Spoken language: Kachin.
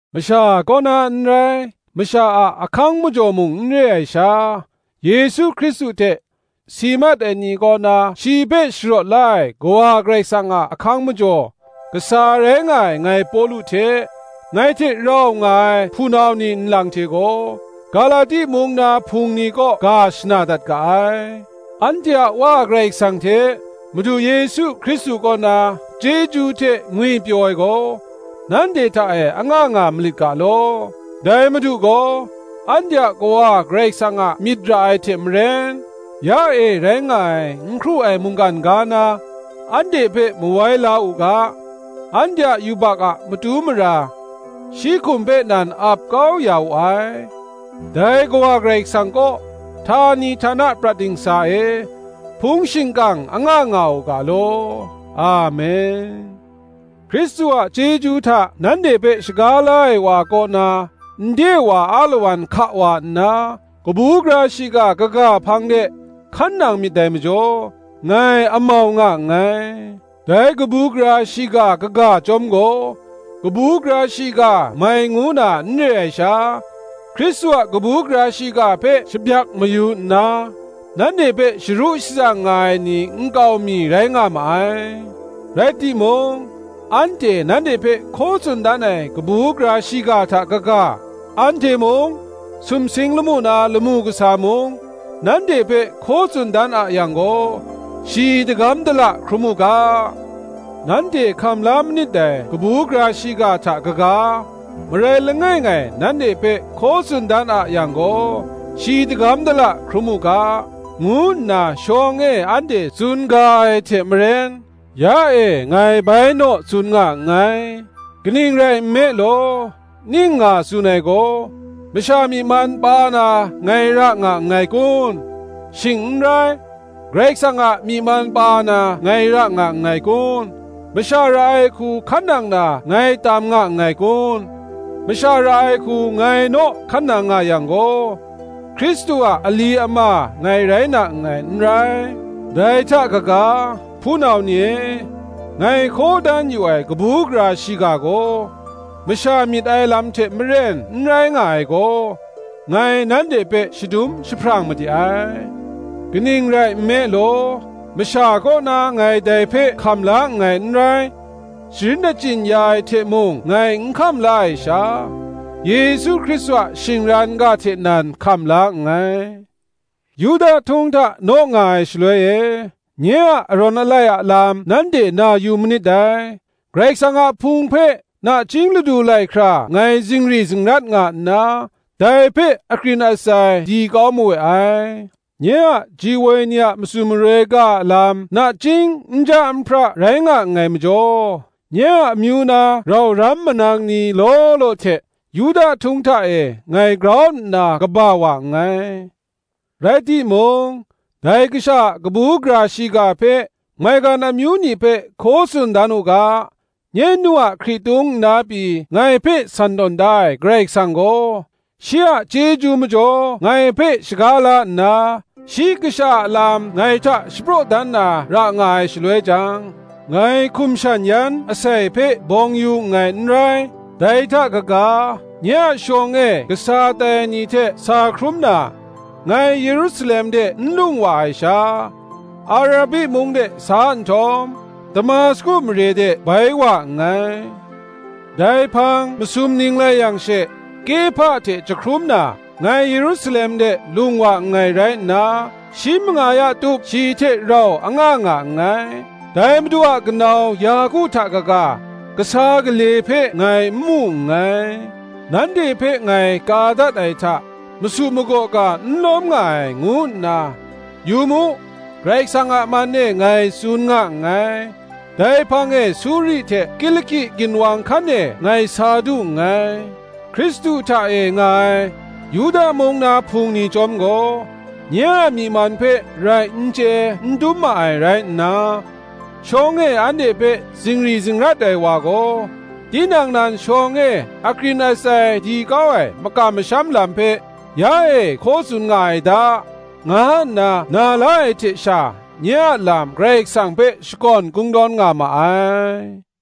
Masha kaw na n rai, masha a ahkang majaw mung n re ai sha, Yesu Hkristu hte si mat ai ni kaw na shi hpe sharawt la ai Kawa Karai Kasang a ahkang majaw kasa rai nga ai ngai Pawlu hte, ngai hte rau nga ai hpunau ni nlang hte gaw, Galati mung na Hpung ni kaw ga shana dat ga ai. Anhte a Wa Karai Kasang hte Madu Yesu Hkristu kaw na chyeju hte ngwipyaw ai gaw, nanhte hta e anga nga malit ga law. Dai Madu gaw, anhte a Kawa Karai Kasang a myit ra ai hte maren, ya e rai nga ai n hkru ai mungkan ga na anhte hpe mawai la u ga, anhte a yubak a matu mara shi hkum hpe nan ap kau ya wu ai. Dai Kawa Karai Kasang kaw, htani htana prat dingsa e hpung shingkang anga nga u ga law. Amen. Hkristu a chyeju hta nanhte hpe shaga la ai wa kaw na nde wa alawan hka wa nna, kabu gara shiga kaga hpang de hkan nang myit dai majaw, ngai amau nga nngai. Dai kabu gara shiga kaga chyawm gaw, kabu gara shiga mai ngu na n re ai sha, Hkristu a kabu gara shiga hpe shabyak mayu nna, nanhte hpe sharu shatsang nga ai ni nkau mi rai nga ma ai. Rai timung, anhte nanhte hpe hkaw tsun dan ai kabu gara shiga hta kaga, anhte mung, sumsing lamu na lamu kasa mung, nanhte hpe hkaw tsun dan a yang gaw, shi dagam dala hkrum u ga. Nanhte hkam la manit dai kabu gara shiga hta kaga, marai langai ngai nanhte hpe hkaw tsun dan a yang gaw, shi dagam dala hkrum u ga, ngu nna shawng e anhte tsun ga ai hte maren, ya e ngai bai naw tsun nga nngai. Kaning rai nme law, ning nga tsun ai gaw, masha myi man pa na ngai ra nga nngai kun? shing n rai, Karai Kasang a myi man pa na ngai ra nga nngai kun? Masha ra ai hku hkan nang na ngai tam nga nngai kun? Masha ra ai hku ngai naw hkan nang nga yang gaw, Hkristu a ali ama ngai rai na nngai n rai. Dai hta kaga, hpunau ni e, ngai hkaw dan yu ai kabu gara shiga gaw, masha myit ai lam hte maren n rai nga ai gaw, ngai nanhte hpe shadum jahprang made ai. Kaning rai nme law, masha kaw na ngai dai hpe hkam la nngai n rai; sharin achyin ya ai hte mung ngai n hkam la ai sha, Yesu Hkristu a shingran ga hte nan hkam la nngai. Yuda htung hta naw nga ai shaloi e, nye a arawn alai a lam nanhte na yu manit dai; Karai Kasang a Hpung hpe nachying ladu lai hkra ngai zingri zingrat nga nna, dai hpe akrin atsai di kau mawe ai. Nye a ji woi ni a matsun maroi ga a lam nachying nja nhpra rai nga nngai majaw, nye a amyu na rau ram manang ni law law hte, Yuda htung hta e ngai grau nna kaba wa nngai. Rai timung, dai Kasha a kabu gara shiga hpe maigan amyu ni hpe hkaw tsun dan u ga, nye nu a hkritung nna pyi ngai hpe san tawn da ai Karai Kasang gaw, shi a chyeju majaw ngai hpe shaga la nna shi Kasha a lam ngai hta shapraw dan na ra nga ai shaloi jang, ngai hkum shan yan asai hpe bawng yu nngai n rai. Dai hta kaga nye a shawng e kasa tai ai ni hte sa hkrum na, ngai Yerusalem de n lung wa ai sha, Arabi mung de sa nhtawm, Damasku mare de bai wa nngai. Dai hpang masum ning lai yang she Kehpa hte jahkrum na, ngai Yerusalem de lung wa nngai rai nna, shi manga ya tup shi hte rau anga nga nngai. Dai Madu a kanau Yaku hta kaga, Kasa gale hpe ngai n mu nngai. Nanhte hpe ngai ka dat ai hta, masu magaw ga n lawm nga ai ngu nna, yu mu, Karai Kasang a man e ngai tsun nga nngai. Dai hpang e Suri hte Kiliki ginwang hkan e ngai sa du nngai. Hkristu hta e nga ai, Yuda mung na Hpung ni chyawm gaw, nye a myi man hpe rai n chye n dum ma ai rai nna, Shawng e anhte hpe zingri zingrat ai wa gaw, tinang nan shawng e akrin atsai di kau ai makam masham lam hpe, ya e hkaw tsun nga ai da, nga nna na la ai hte sha, nye a lam Karai Kasang hpe shakawn kungdawn nga ma ai.